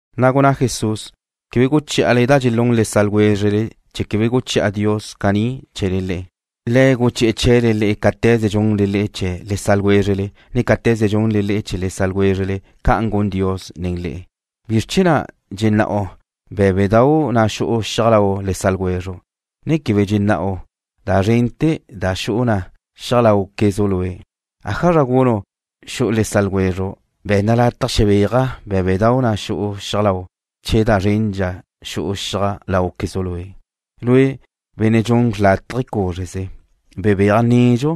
Na' gunná Jesús: ―Quebe guchí'ale da dxelún le sa' ljwézrele chee̱ quebe guchi'a Dios caní chee̱le le'e. Le̱' guchi'e̱ chee̱le le'e cáte̱ze dxunle le'e chee̱ le sa' ljwézrele, ne cáte̱ze dxunle le'e chee̱ le sa' ljwézrele, ca'an gun Dios nen le'e. ¿Bizr chee̱ na' dxená'u bé̱bedau' da xu'u xiaj lau le sa' ljwezru', ne quebe dxená'u da zrente̱ da xu'u na xiaj láuquezu' lue'? ¿Ájazra gunu' xu'u le sa' ljwezru': “Be̱nna lataj xebéaja' bé̱bedau' da xu'u xiaj lau'”, che da zrendxa xu'u xiaj láuquezu' lue'? Lue', benne' dxun xrlátaje cúzreze. Bebéaj nedxu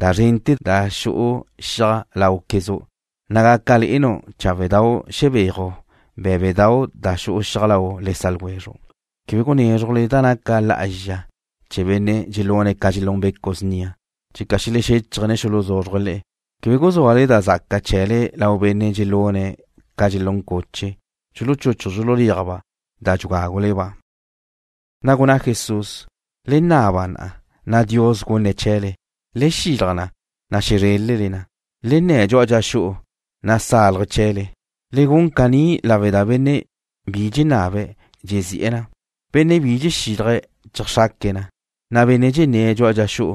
da zrente̱ da xu'u xiaj láuquezu', na' gaca le'enu' cháwedau' xebéaju' bé̱bedau' da xu'u xiaj lau le sa' ljwezru'. ’Quebe gunézrujle da naca lá'azxa chee̱ benne' dxelune̱' ca dxelún becu' snia, checa xelexéchaje̱', ne xuluzúzrue̱' le'e. Quebe guzúale da zaca chee̱le lau benne' dxelune̱' ca dxelún cuche, dxuluchuchuj dxululéajba' da dxugágule-ba'. Na' gunná Jesús: ―Le naba, na' Dios gunne̱' na chee̱le. Le xilaj na, na' xezrélele na. Le nne̱ dxu'a dxa xu'u, na' sáluje̱' chee̱le. Le gun caní lawe' da benne' bi dxenabe̱', dxezi'e̱ na. Benne' bi dxexílaje̱', dxeajxraque̱' na, na' benne' dxenné̱' dxu'a dxa xu'u,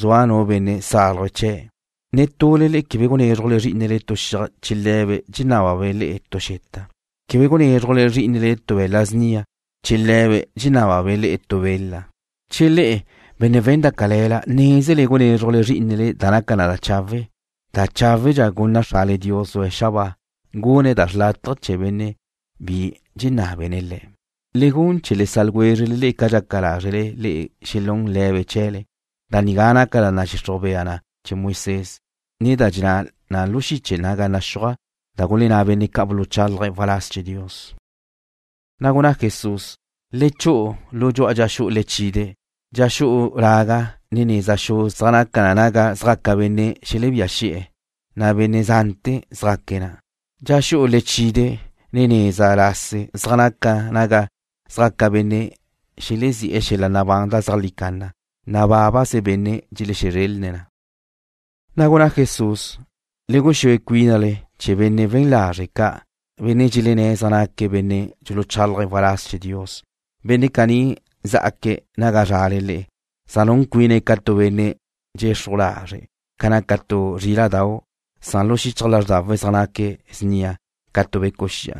zua nu benne' sáluje̱' chee̱'. ’Netule le'e quebe gunézrujle zrí'inele tu xiaj che le̱be' dxenábabe' le'e tu xeta. Quebe gunézrujle zrí'inele tu be̱la' snia che le̱be' dxenábabe' le'e tu bela. Che le'e, benne' we̱n da cale̱la, nézele gunézrujle zrí'inele da naca na chawe', da cháwedxa gunna Xrale Dios zua xabáa, gunne̱' da chawe' chee̱ benne' bi dxenábene̱' Le̱'. ’Le gun chee̱ le sa' ljwézrele ca dxaca lázrele le'e xelún le̱be' chee̱le. Da nigá naca da nadxixruj bea na Moisés, ne da dxenná na lu xiche naga naxúaj da gulenná benne' ca' buluchálaje̱' waláz chee̱ Dios. Na' gunná Jesús: ―Le chu'u lu dxa xu'u lechide'. Dxa xu'u laga, ne neza xu zaj naca naga zjaca benne' xelebía xi'e̱, na' benne' zante̱ zjaque̱' na'. Dxa xu'u lechide', ne neza lase zaj naca naga zjaca benne' xelezí'e̱ xel-la' nabán da zeajlí canna, na' bábaze benne' dxelexezrelne̱' na. Na' gunná Jesús: ―Le guxúe cuínale chee̱ benne' we̱n lazre' ca', benne' dxelenné̱' zaj naque̱' benne' dxuluchálaje̱' waláz chee̱ Dios. Benne' caní zá'aque̱' naga zrale le'e, zaj nun cuine̱' ca tu benne' dxexruj lazre' ca naca tu zríla'dau', san lu xichaj lázrdawe̱' zaj naque̱' snia ca tu becu' xi'a.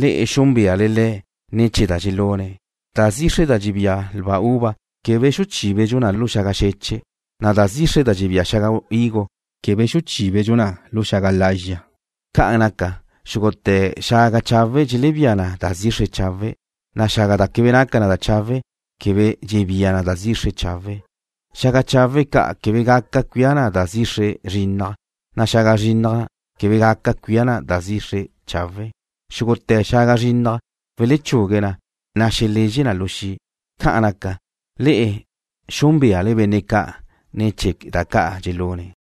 Le'e xúnbeale le̱' ne̱ chee̱ da dxelune̱'. Da zixre da dxebía lba uva quebe xuchíbedxu na lu xaga xeche', na' da zixre da dxebía xaga higo quebe xuchíbedxu na lu xeche' ga'. Ca'an naca, xúgute̱ xaga chawe' dxelebía na da zixre chawe', na' xaga da quebe naca na chawe', quebe dxebía na da zixre chawe'. Xaga chawe' ca' quebe dxelebía na da zrinnaj, na' xaga zrinnaj na' quebe dxebía na da chawe'. Xúgute̱ xaga zrinnaj welechugue na, na' xelezxe na lu xi'. Ca'an naca, le'e xúnbeale benne' ca' ne̱ chee̱ da ca' dxelune̱'.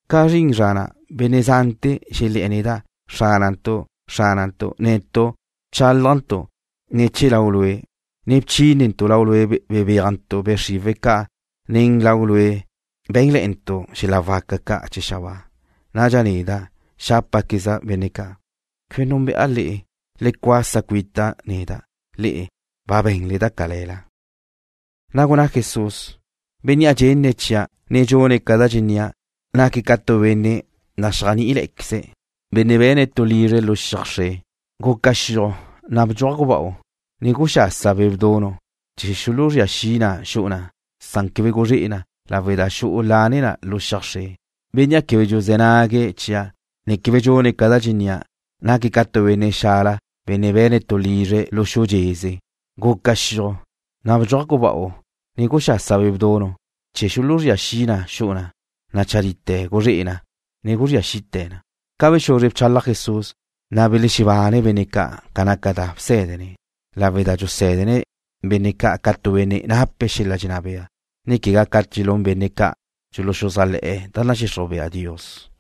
Ca zrin zra na', benne' zante̱ xelé̱'e̱ neda': “Xránantu', Xránantu', netu' bchálajntu' ne̱ chee̱ Lau' Lue', ne bchínentu' Lau' bebéajntu' be' xriwe̱' ca', ne nen Lau' Lue' bé̱nle̱'e̱ntu' xel-la' waca ca' chee̱ xabáa.” Nadxa neda' xápaqueza' benne' ca': “Quebe núnbe'a le'e. Le cuasa cuita' neda', le'e, ba be̱nle da cale̱la.” Na' gunná Jesús: ―Bénnea' dxenne̱' chia', ne dxune̱' ca da dxennía', naque̱' ca tu benne' naxéajni'iqueze', benne' be̱ne̱' tu lizre̱' lu xiaj xre. Guca xiuj, na' bdxuaj guba'u, ne guxasa be' bdunu' chee̱ xuluzría xi na xu'u na', san quebe guzré'e na lawe' da xu'u lane na lu xiaj xre. Bénnea' quebe dxuzé̱ nague̱' chia', ne quebe dxune̱' ca da dxennía', naque̱' ca tu benne' xala, benne' be̱ne̱' tu lizre̱' lu xu dxeze. Guca xiuj, na' bdxuaj guba'u ne guxasa be' bdunu' chee̱ xuluzría xi na xu'u na', na' chadite guzré'e na, ne guzría xite̱ na. Ca bexuzre bchalaj Jesús, na' belexebanne benne' ca' ca naca da bsé̱dene̱', lawe' da dxusé̱dene̱' benne' ca' ca tu benne' nape̱' xel-la' dxenná bea, ne quegá ca dxelún benne' ca' dxuluxuzájle̱'e̱ da nadxixruj bea Dios.